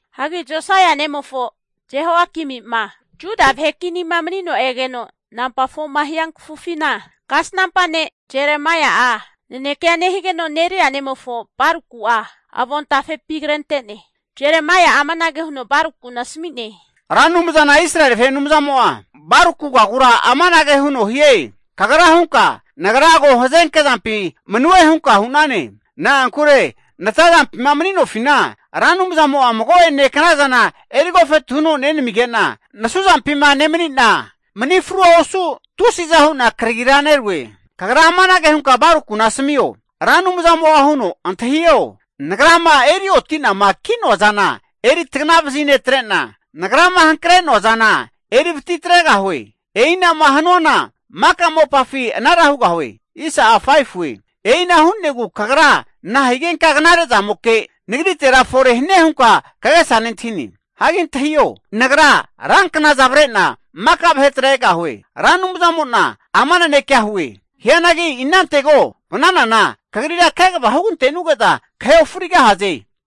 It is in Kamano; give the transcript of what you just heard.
Hagi Josaia nemofo Jehoiakimi'ma Juda vahe kinima mani'no egeno nampa 4ma hia kafufina, kasnampa ne' Jeremaia'a nanekea nehigeno Neria nemofo Baruku'a avontafepi krente'ne. Jeremaia'a amanage huno Barukuna asami'ne, Ra Anumzana Israeli vahe Anumzamo'a Barukugagura amanage huno hie, kagra hunka, nagra ko hazenke zampi manue hunka hu'nane. Na'ankure natazampima mani'nofina Ra Anumzamo'a mago'ene knazana eri agofetu huno nenamige'na, nasuzampina nemani'na mani frua osu tusiza hu'na karagira nerue. Kagra amanage hunka Barukuna asamio, Ra Anumzamo'a huno, antahio! Nagrama eri oti'nama ki'noa zana, eri tagna vazinetre'na, Nagrama hankre'noa zana eri vati atregahue. E'ina'ma hanuana maka mopafi anara hugahue. E'ina hu'negu kagra nahigenka knare zamoke nagritera fore hanie hunka kagesa nentahine? Hagi antahio! Nagra ranknaza avre'na maka vahetera egahue, Ra Anumzamo'na ama nanekea hue. Hianagi inantego vananana kagrira kegava hugante'nuge'za kahe ofrigahaze.